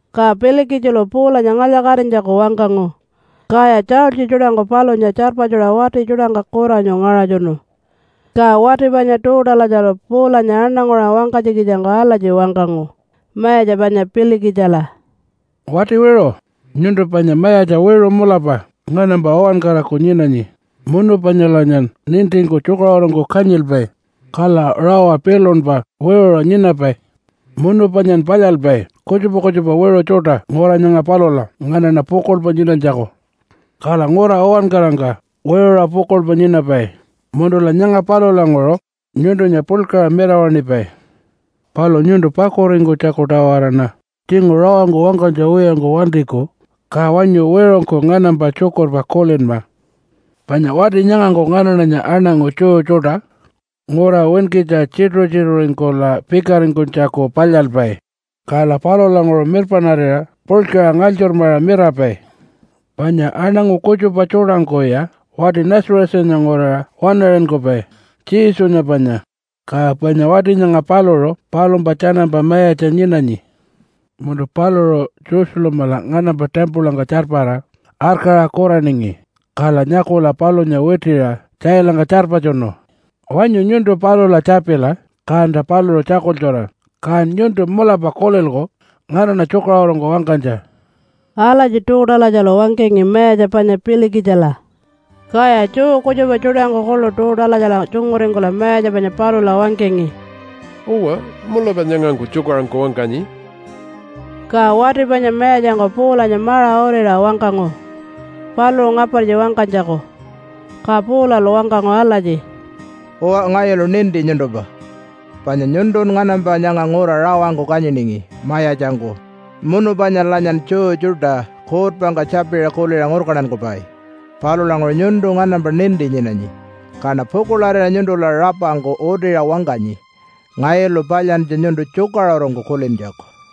Ka Pilikitjilu Paulanya ngalya-katinytjaku wangkangu, kaya tjaultji tjuṯangku palunya tjarpatjuṟa wati tjuṯangka kuranyu ngaṟatjunu. Ka wati panya Tuutalatjalu Paulanya aṉanguṟa wangkanytjikitjangku alatji wangkangu mayatja panya Pilikitjila, “Wati wiṟu! Nyuntu panya mayatja wiṟu mulapa nganampa uwankaraku nyinanyi munu panyalanyan nintingku tjukaṟurungku kanyilpai, kala rawa pilunpa wiṟuṟa nyinapai. Munu panyan palyalpai kutjupa kutjupa wiṟu tjuṯa ngura nyanga palula nganaṉa pukuḻpa nyinanytjaku. Kala ngura uwankarangka wiṟuṟa pukuḻpa nyinapai munula nyanga palulanguṟu nyuntunya puḻkaṟa mirawaṉipai. Palu nyuntu pakuringkunytjaku-tawaraṉa tjinguṟu rawangku wangkanytja wiyangku wantiku, ka wanyu wiṟungku nganampa tjukurpa kulinma. Panya wati nyangangku nganaṉanya aṉangu Jew tjuṯa ngura winkitja tjituṟu-tjituṟuringkula pikaringkunytjaku palyalpai, kala palulanguṟu mirpaṉarira puḻkaṟa ngalytjurmaṟa mirapai. Panya aṉangu kutjupa tjuṯangkuya wati Nazarethanya nguraṟa waṉaṟinkupai Jesunya panya, ka panya wati nyanga paluṟu palumpa tjanampa mayatja nyinanyi. Munu paluṟu Jerusalemala nganampa timpulangka tjarpara arkaṟa kuraningi, kala nyakula palunya witiṟa tjailangka tjarpatjunu. Wanyu nyuntu palula tjapila, kanta paluṟu tjakultjura. Kan nyuntu mulapa kulilku nganaṉa tjukaṟurungku wangkanytja.” Alatji Tuutalatjalu wangkangi mayatja panya Pilikitjila. Kaya Jew kutjupa tjuṯangku kuḻu Tuutalatjala tjunguringkula mayatja panya palula wangkangi, “Uwa, mulapa nyangangku tjukaṟurungku wangkanyi.” Ka wati panya mayatjangku Paulanya maṟa uriṟa wangkangu paluṟu ngapartji wangkanytjaku. Ka Paulalu wangkangu alatji, “Uwa, ngayulu ninti nyuntumpa, panya nyuntun nganampa nyanga ngura rawangku kanyiningi mayatjangku munu panyalanyan Jew tjuṯa kuutpangka tjapiṟa kuliṟa ngurkantankupai. Palulanguṟu nyuntu nganampa ninti nyinanyi, kaṉa pukuḻarira nyuntula rapangku utiṟa wangkanyi ngayulu palyantja nyuntu tjukaṟurungku kulintjaku.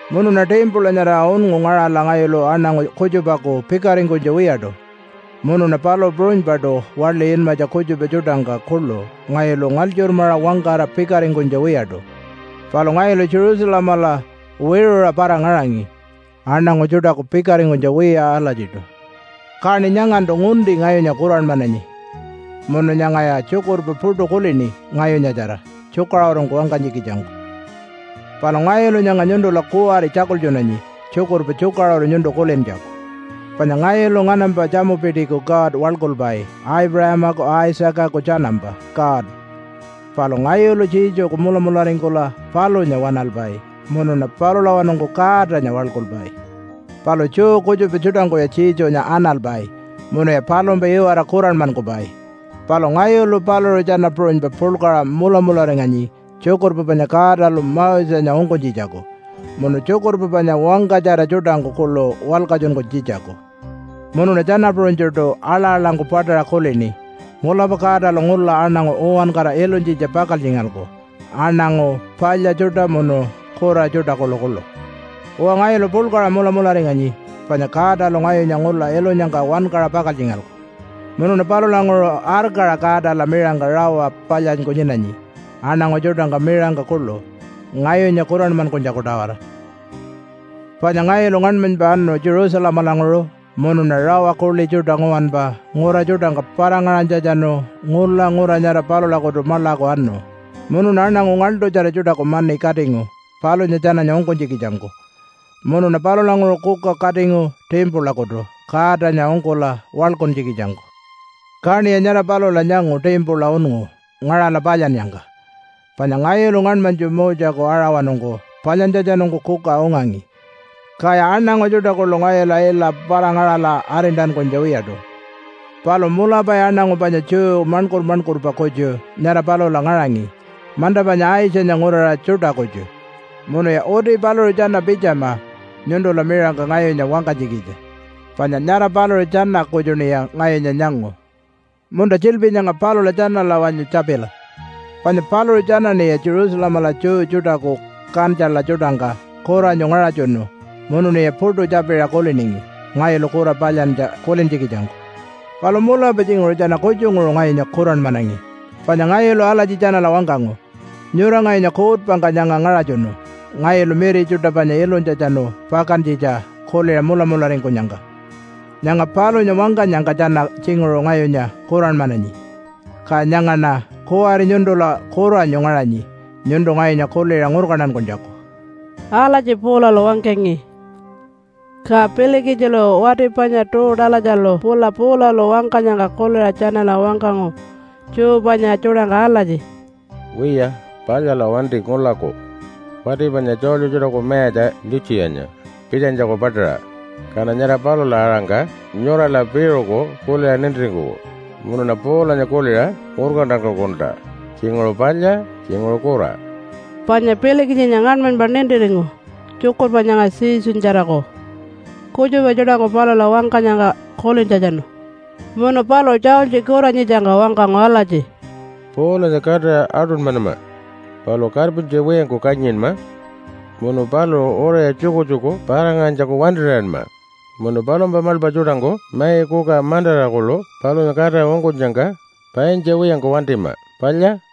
Munuṉa timpula nyara unngu ngaṟala ngayulu aṉangu kutjupaku pikaringkunytja wiyaṯu, munuṉa palu puṟunypaṯu waḻi inmatja kutjupa tjuṯangka kuḻu ngayulu ngalytjurmaṟa wangkara pikaringkunytja wiyaṯu. Palu ngayulu Jerusalemala wiṟuṟa para-ngaṟangi aṉangu tjuṯaku pikaringkunytja wiya alatjiṯu. Kaṉi nyangantu ngunti ngayunya kuranmananyi munu nyangaya tjukurpa puṯu kulini ngayunyatjara tjukaṟurungku wangkanytjikitjangku. “Palu ngayulu nyanga nyuntula kuwari tjakultjunanyi tjukurpa tjukaṟuru nyuntu kulintjaku. Panya ngayulu nganampa tjamupitiku God waḻkulpai Aipuṟamaku Isaacaku tjanampa God. Palu ngayulu Jesuku mulamularingkula palunya waṉalpai munuṉa palulawanungku Godanya waḻkulpai. Palu Jew kutjupa tjuṯangkuya Jesunya analpai munuya palumpa iwara kuranmankupai. Palu ngayulu paluṟu tjana puṟunypa puḻkaṟa mulamularinganyi tjukurpa panya Godalu Mosenya ungkunytjitjaku munu tjukurpa panya wangkatjara tjuṯangku kuḻu walkatjunkunytjitjaku. Munuṉa tjana puṟunytjuṯu aḻa-aḻangku paṯaṟa kulini, ‘Mulapa Godalu ngula aṉangu uwankara ilunytjitja pakaltjingalku aṉangu palya tjuṯa munu kura tjuṯa kuḻukuḻu.’ Uwa, ngayulu puḻkaṟa mulamularinganyi panya Godalu ngayunya ngula ilunyangka wankaṟa pakaltjingalku, munuṉa palulanguṟu arkaṟa Godala miṟangka rawa palyanyku nyinanyi aṉangu tjuṯangka miṟangka kuḻu ngayunya kuranmankunytjaku-tawara. “Panya ngayulu ngaṉmanypa anu Jerusalemalanguṟu munuṉa rawa kuḻi tjuṯa nguwanpa ngura tjuṯangka para-ngaṟanytjatjanu ngula ngura nyara palulakutu maḻaku anu munuṉa aṉangu ngaḻṯutjara tjuṯaku mani katingu palunya tjananya ungkunytjikitjangku. Munuṉa palulanguṟu kuka katingu timpulakutu Godanya ungkula waḻkuntjikitjangku. Kaṉiya nyara palula nyangu timpula unngu ngaṟala palyannyangka. Panya ngayulu ngaṉmanytju Moseku aṟawanungku palyantjatjanungku kuka ungangi. Kaya aṉangu tjuṯa kuḻu ngayula ila para-ngaṟala arintankunytja wiyaṯu. Palu mulapaya aṉangu panya Jew maṉkur-maṉkurpa kutju nyara palula ngaṟangi manta panya Aitjanya nguraṟa tjuṯa kutju. Munuya uti paluṟu tjana pitjama nyuntula miṟangka ngayunya wangkanytjikitja panya nyara paluṟu tjana kutjuṉiya ngayunya nyangu. Munta, tjiḻpi nyanga palula tjanala wanyu tjapila. Panya paluṟu tjanaṉiya Jerusalemala Jew tjuṯaku kantjula tjuṯangka kuranyu ngaṟatjunu munuṉiya puṯu tjapiṟa kuliningi ngayulu kura palyantja kulintjikitjangku. Palu mulapa tjinguṟu tjana kutjunguṟu ngayunya kuranmanangi panya ngayulu alatji tjanala wangkangu, ‘Nyura ngayunya kuutpangka nyanga ngaṟatjunu ngayulu miri tjuṯa panya ilunytjatjanu pakantjitja kuliṟa mulamularingkunyangka.’ Nyanga palunya wangkanyangka tjana tjinguṟu ngayunya kuranmananyi, ka nyangaṉa kuwari nyuntula kuranyu ngaṟanyi nyuntu ngayunya kuliṟa ngurkantankunytjaku.” Alatji Paulalu wangkangi. Ka Pilikitjilu wati panya Tuutalatjalu pula Paulalu wangkanyangka kuliṟa tjanala wangkangu Jew panya tjuṯangka alatji, “Wiya, palyala wanti ngulaku wati panya tjaultji tjuṯaku mayatja Litjiyanya pitjanytjaku paṯaṟa. Kaṉa nyara palula-aṟangka nyurala piṟuku kuliṟa nintiringkuku munuṉa Paulanya kuliṟa ngurkantankukulta tjinguṟu palya, tjinguṟu kura.” Panya Pilikitjinya ngaṉmanypa nintiringu tjukurpa nyanga Jesunyatjaraku kutjupa tjuṯangku palula wangkanyangka kulintjatjanu. Munu paluṟu tjaultji kuranyitjangka wangkangu alatji, “Paulanya katira aṯunymanama palu karpintja wiyangku kanyinma munu paluṟu uriṟa tjukutjuku para-ngaṟanytjaku wantir'iyanma. Munu palumpa maḻpa tjuṯangku mai, kuka mantara kuḻu palunya katira ungkunyangka paintja wiyangku wantima. Palya!”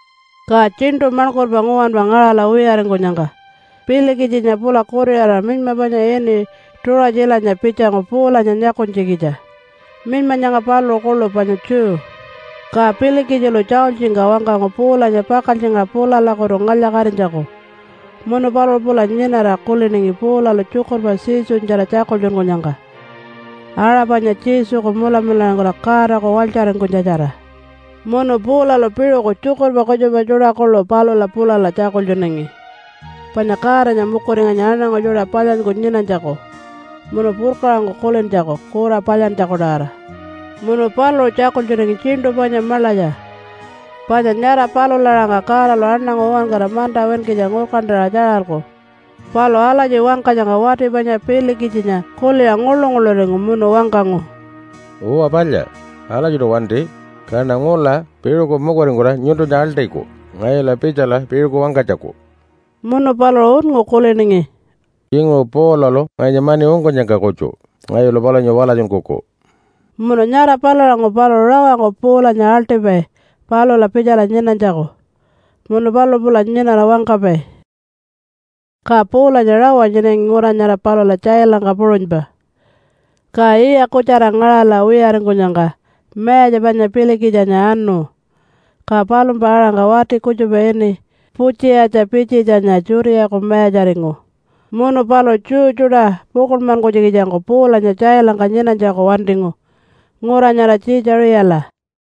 Ka tjiṉṯu maṉkurpa nguwanpa ngaṟala wiyaringkunyangka Pilikitjinya pula kuriṟara minyma panya ini Tuṟatjilanya pitjangu Paulanya nyakunytjikitja. Minyma nyanga paluṟu kuḻu panya Jew. Ka Pilikitjilu tjaultjingka wangkangu Paulanya pakaltjingaṟa pulalakutu ngalya-katinytjaku. Munu paluṟu pula nyinara kuliningi Paulalu tjukurpa Jesunyatjara tjakultjunkunyangka aṟa panya Jesuku mulamularingkula Godaku walytjaringkunytjatjara. Munu Paulalu piṟuku tjukurpa kutjupa tjuṯa kuḻu palula pulala tjakultjunangi, panya Godanya mukuringanyi aṉangu tjuṯa palyanyku nyinanytjaku munu purkaṟangku kulintjaku kura palyantjaku-tawara. Munu paluṟu tjakultjunangi tjiṉṯu panya maḻatja, panya nyara palula aṟangka Godalu aṉangu uwankara manta winkitja ngurkantaṟa tjaralku. Palu alatji wangkanyangka wati panya Pilikitjinya kuliṟa nguḻu-nguḻuringu munu wangkangu, “Uwa palya! Alatjiṯu wanti, kaṉa ngula piṟuku mukuringkula nyuntunya aḻṯiku ngayula pitjala piṟuku wangkanytjaku.” Munu paluṟu unngu kuliningi, “Tjinguṟu Paulalu ngayunya mani ungkunyangka kutju ngayulu palunya walatjunkuku.” Munu nyara palulanguṟu paluṟu rawangku Paulanya aḻṯipai palula pitjala nyinanytjaku, munu paluṟu pula nyinara wangkapai. Ka Paulanya rawa nyinangi ngura nyara palula tjailangka puṟunypa. Ka yiya kutjara ngaṟala wiyaringkunyangka mayatja panya Pilikitjinya anu, ka palumpa aṟangka wati kutjupa ini Putjiyatja Pitjitjanya Judeaku mayatjaringu munu paluṟu Jew tjuṯa pukuḻmankunytjikitjangku Paulanya tjailangka nyinanytjaku wantingu ngura nyara Tjiitjaṟiyala.